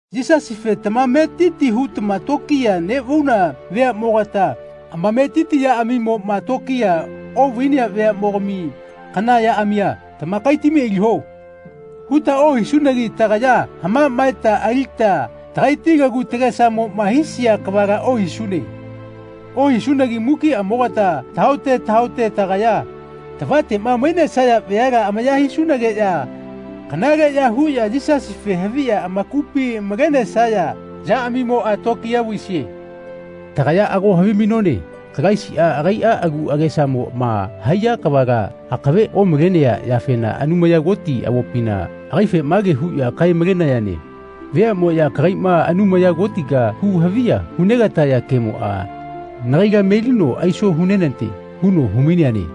Yisasife tamametiti huta tokiya neꞌvauna veaꞌmogata amametiti yaꞌamimoꞌma tokiya oꞌvainea veaꞌmogami kana yaꞌamia “Tamakaitami aliho.” huta ohisunagi tagaya haꞌmaꞌmaeta alita tagaiti lagu tagesamoꞌma haisia kavala ohisune. Ohisunagi mukiꞌamogata tahaote tahaote tagaya tavateꞌma mainesaya veala amaya hisunageꞌya kanaleꞌya huꞌya Yisasife haviꞌya amakupi malenesaya yaꞌamimoꞌa tokiya vaisie. Tagaya ago havimainone Kalaisiꞌa agaiꞌa agu agesamoꞌma haiya kavala akave omalenea yafena Anumaya Koti avopina agaife mage huꞌya kae-malenayane “Veaꞌmoꞌya kagaiꞌma Anumaya Kotiga hu haviya hunegataya kemoꞌa nagaila melino aiso hunenate.” huno humaineane.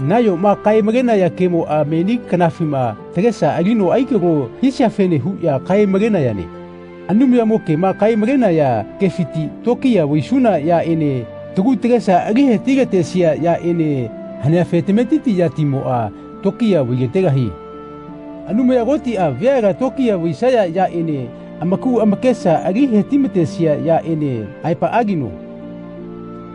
Nayoma kae-malenaya kemoꞌa meni kanafima tagesa alino akalo hisiafene huꞌya kae-malenayane. Anumayamo kema kae-malenaya kefiti tokiya vaisuna yaꞌene tagu tagesa ali heti-latesia yaꞌene haneafe tametiti yatimoꞌa tokiya vailategahie. Anumaya Kotiꞌa veala tokiya vaisaya yaꞌene amaku amakesa ali hetimatesia yaꞌene aepaꞌagino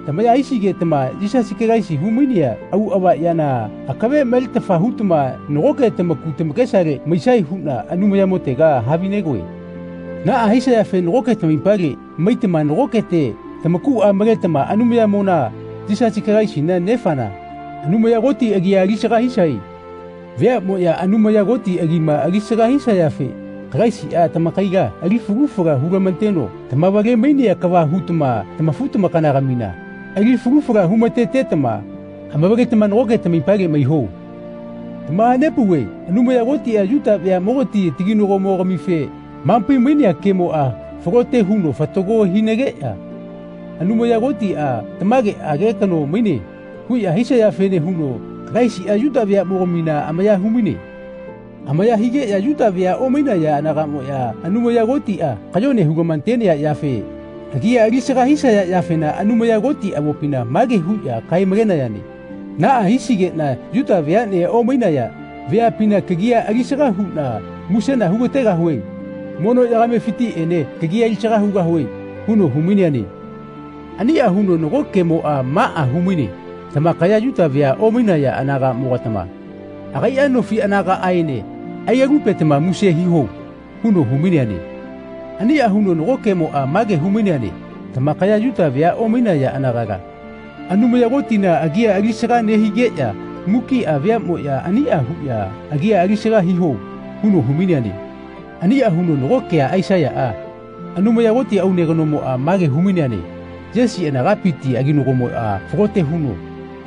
tamaya hisigetama Yisasi Kalaisi humainea auꞌava yana akave maletafa hutama nagoke tamaku tamakesale maisae huꞌna Anumayamotega havinegoe. Naꞌa hisayafe nagoke tamaipale maitama nagokete tamakuꞌa maletama Anumayatimona Yisasi Kalaisina Nefana Anumaya Koti agia alisaga hisae. Veaꞌmoꞌya Anumaya Koti agima alisaga hisayafe Kalaisiꞌa tamakaila ali falu fala hulamateno tamavale-mainea kava hutama tamafu-tamakanagamina ali falu fala humatetama amavaletama nagoke tamaipale maiho. Tamahapauve Anumaya Kotiꞌa Yuta veaꞌmogati taginagomogamife hamapai-mainea kemoꞌa falote huno fatago hinageꞌya “Anumaya Kotiꞌa tamageꞌage kano maine.” huꞌya hisayafene huno Kalaisiꞌa Yuta veaꞌmogamina amaya humaine. Amaya higeꞌya Yuta vea omainaya anagaꞌmoꞌya Anumaya Kotiꞌa kayone hulamatenea yafe agia alisaga hisaya yafena Anumaya Koti avopina mage huꞌya kae-malenayane “Naꞌa hisigeꞌna Yuta veaꞌne omainaya veapina kagia alisaga huꞌna musena hugategahue. Mono yagamefitiꞌene kagia alisaga hugahue.” huno humaineane. Aniꞌa huno nago kemoꞌa maꞌa humaine “Tamakaya Yuta vea omainaya anagaꞌmogatama agaiꞌa nofi anagaꞌaene ailalupetama muse hiho.” huno humaineane. Aniꞌa huno nago kemoꞌa mage humaineane “Tamakaya Yuta vea omainaya anagala Anumaya Kotina agia alisaga nehigeꞌya mukiꞌa veaꞌmoꞌya aniꞌa huꞌya agia alisaga hiho.” huno humaineane. Aniꞌa huno nago kea Aisaiyaꞌa Anumaya Koti aune kanomoꞌa mage humaineane “Yesi anagapiti aginagomoꞌa falote huno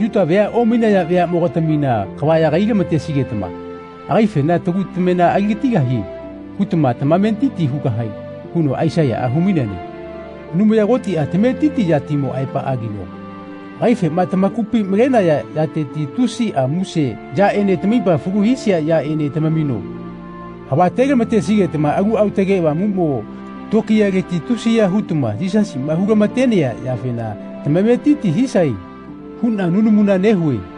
Yuta vea omainaya veaꞌmogatamina kava yagai-lamatesigetama agaifena ‘Tagu tamena aligatigahie.’ hutama tamametiti hugahae.” huno Aisaiyaꞌa humaineane. Anumaya Kotiꞌa tametiti yatimo aepaꞌagino agaifema tamakupi malenaya yateti tusiꞌa muse yaꞌene tamaipa falu hisia yaꞌene tamamino havatelamatesigetama Alu Aotage Avamuꞌmo tokiyaleti tusiya hutama Yisasiꞌma hulamatenea yafena tamametiti hisae huꞌna nunamuna nehue.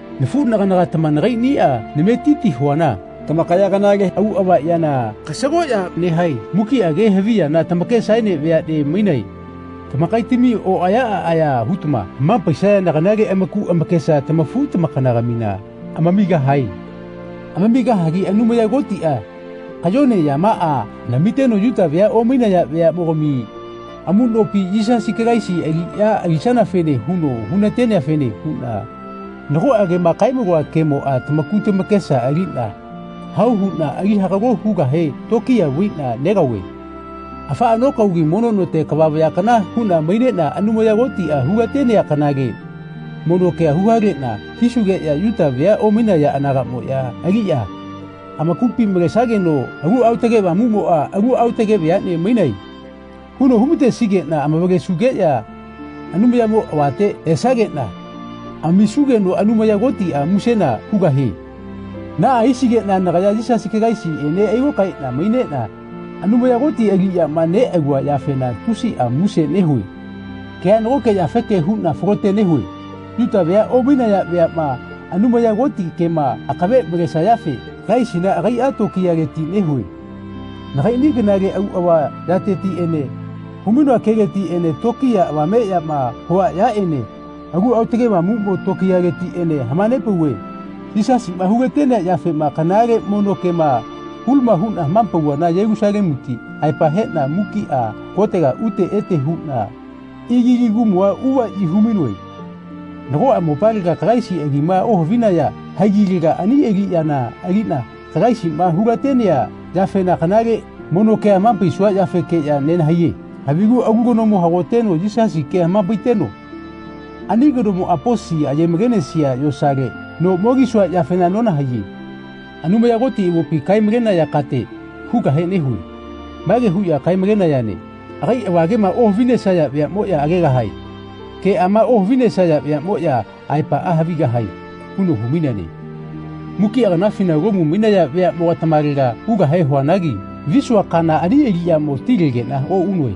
Nafuꞌnaganagatama nagaiꞌniꞌa nametiti huana tamakaya kanale auꞌava yana kasagoꞌya nehae. Mukiꞌa ke havi yana tamakesaene veaꞌne mainae. Tamakaitami oꞌaya aꞌaya hutama hamapaisayana kanale amaku amakesa tamafu-tamakanagamina amamigahae. Amamigahagi Anumaya Kotiꞌa kayone yamaꞌa namiteno Yuta vea omainaya veaꞌmogami amuꞌnopi Yisasi Kalaisi aliꞌya alisanafene huno hunateneafene huꞌna nagoꞌa kema kaemaloa kemoꞌa tamaku tamakesa aliꞌna hao huꞌna ali hagalo hugahe tokiya vaiꞌna negaove. Afaꞌa nokaogi mono note kava vaya kana huꞌna maineꞌna Anumaya Kotiꞌa hulatenea kanale mono kea huhaleꞌna hisugeꞌya Yuta vea omainaya anagaꞌmoꞌya aliꞌya amakupi malesageno Alu Aotage Avamuꞌmoꞌa “Alu aotage veaꞌne mainae.” huno humatesigeꞌna amavalesugeꞌya Anumayamo avate esageꞌna amisugeno Anumaya Kotiꞌa musena hugahie. Naꞌa hisigeꞌna nagaya Yisasi Kalaisiꞌene ailokaeꞌna maineꞌna Anumaya Koti aliꞌyama neꞌalua yafena tusiꞌa muse nehue. Kea nagoke yafeke huꞌna falote nehue. Yuta vea omainaya veaꞌma Anumaya Koti kema akave malesayafe Kalaisina agaiꞌa tokiyaleti nehue. Nagaiꞌni kanale auꞌava yatetiꞌene humainoa keletiꞌene tokiya avameꞌyama hua yaꞌene Alu Aotage Avamuꞌmo tokiyaletiꞌene hamanepauve. Yisasiꞌma hulatenea yafema kanale mono kema hulama huꞌna hamapauvana Yelusalemuti aepa heꞌna mukiꞌa kotega ute ete huꞌna Ililikumua uvaꞌyi humainoe. Nagoꞌa mopalega Kalaisi agima ohavinaya haigilega ani aliꞌyana aliꞌna Kalaisiꞌma hulatenea yafena kanale mono kea hamapaisua yafekeꞌya nenahaiye. Havigu alu kanomo hagoteno Yisasi kea hamapaiteno ani kanomoꞌa posi ayemalenesia yosale no mo kisua yafena nonahaiye. Anumaya Koti avopi kae-malenaya kate hugahe nehue. Mage huꞌya kae-malenayane “Agai avagema ohavinesaya veaꞌmoꞌya agegahae. Keꞌama ohavinesaya veaꞌmoꞌya aepaꞌa havigahae.” huno humaineane. Mukiꞌa kanafina Lomu mainaya veaꞌmogatamalega ugahe huanagi visua kana ani aliꞌyamo tilegeꞌna oꞌunoe.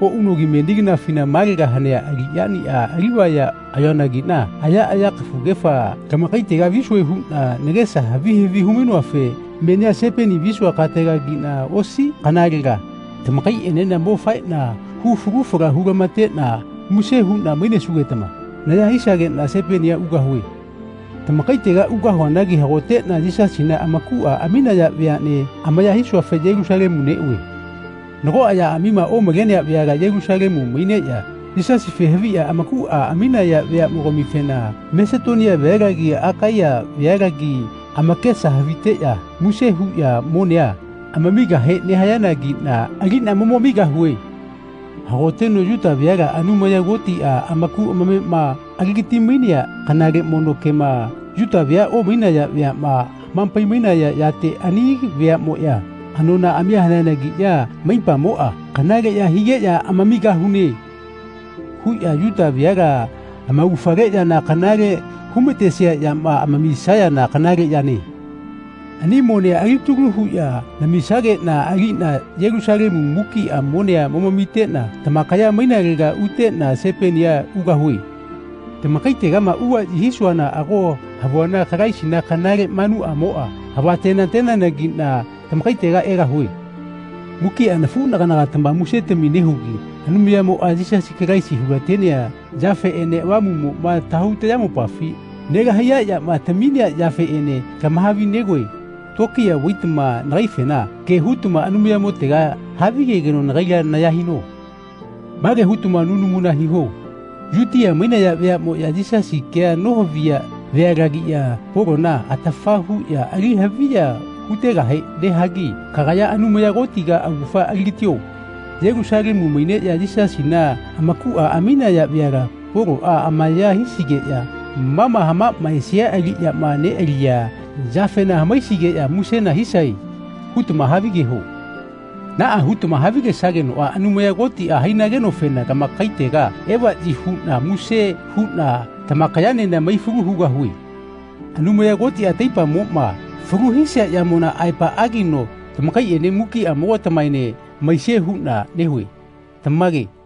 Oꞌunogi meni kanafina malega hanea aliꞌyaniꞌa alivaya ayoanagiꞌna ayaꞌaya kafugefa lamakaitega visue huꞌna nagesa havi havi humainoafe menia Sipeni visua katelagiꞌna osi kanalega tamakaiꞌenena mo faeꞌna hu falu fala hulamateteꞌna muse huꞌna mainesugetama naya hisageꞌna Sipenia ugahue. Tamakaitega ugahuanagi hagoteꞌna Yisasina amakuꞌa aminaya veaꞌne amaya hisuafe Yelusalemu neꞌue. Nagoꞌa yaꞌamima omalenea veala Yelusalemu maineꞌya Yisasife haviꞌya amakuꞌa aminaya veaꞌmogamifena Masetonia vealagi Akaiya vealagi amakesa haviteꞌya muse huꞌya monea amamigahe nehayanagiꞌna aliꞌna momamigahue. Hagoteno Yuta veala Anumaya Kotiꞌa amaku amamema aligati-mainea kanale mono kema Yuta vea omainaya veaꞌma hamapaimainaya yate ani veaꞌmoꞌya anonaꞌamia haneanagiꞌya amaipamoꞌa kanaleꞌya higeꞌya “Amamigahune.” huꞌya Yuta veala amaugafale yana kanale humatesia yama amamisayana kanale yane. Ani monea alitalu huꞌya namisageꞌna aliꞌna Yelusalemu mukiꞌa monea momamiteꞌna tamakaya mainalega uteꞌna Sipenia ugahue. Tamakaitegama uvaꞌyi hisuana ago havuana Kalaisina kanale manuꞌamoꞌa havatenateneanagiꞌna tamakaitega egahue. Mukiꞌa nafuꞌnaganagatama musetami nehugi Anumayatimoꞌa Yisasi Kalaisi hulatenea yafeꞌene Avamuꞌmoꞌma tahau tayamopafi nelahaiya yama taminea yafeꞌene lamahavi-negoe tokiya vaitama nagaifena ke hutama Anumayamotega havigegeno nagaila naya hino. Mage hutama nunamuna hiho “Yutia mainaya veaꞌmoꞌya Yisasi kea nohaviya vealagiꞌya Polona atafa huꞌya ali haviya hutegahe nehagi kagaya Anumaya Kotiga augafa aligatio. Yelusalemu maineꞌya Yisasina amakuꞌa aminaya veala Poloꞌa amaya hisigeꞌya ma ma hamaꞌmaesia aliꞌyama neꞌalia yafena hamaisigeꞌya musena hisae.” hutama havigeho. Naꞌa hutama havigesagenoꞌa Anumaya Kotiꞌa hainagenofena lamakaitega evaꞌyi huꞌna muse huꞌna tamakayaenena maifalu hugahue. Anumaya Kotiꞌa taipamoꞌma falu hisia yamona aepaꞌagino tamakaiꞌene mukiꞌamogatamaene maisie huꞌna nehue. Tamage.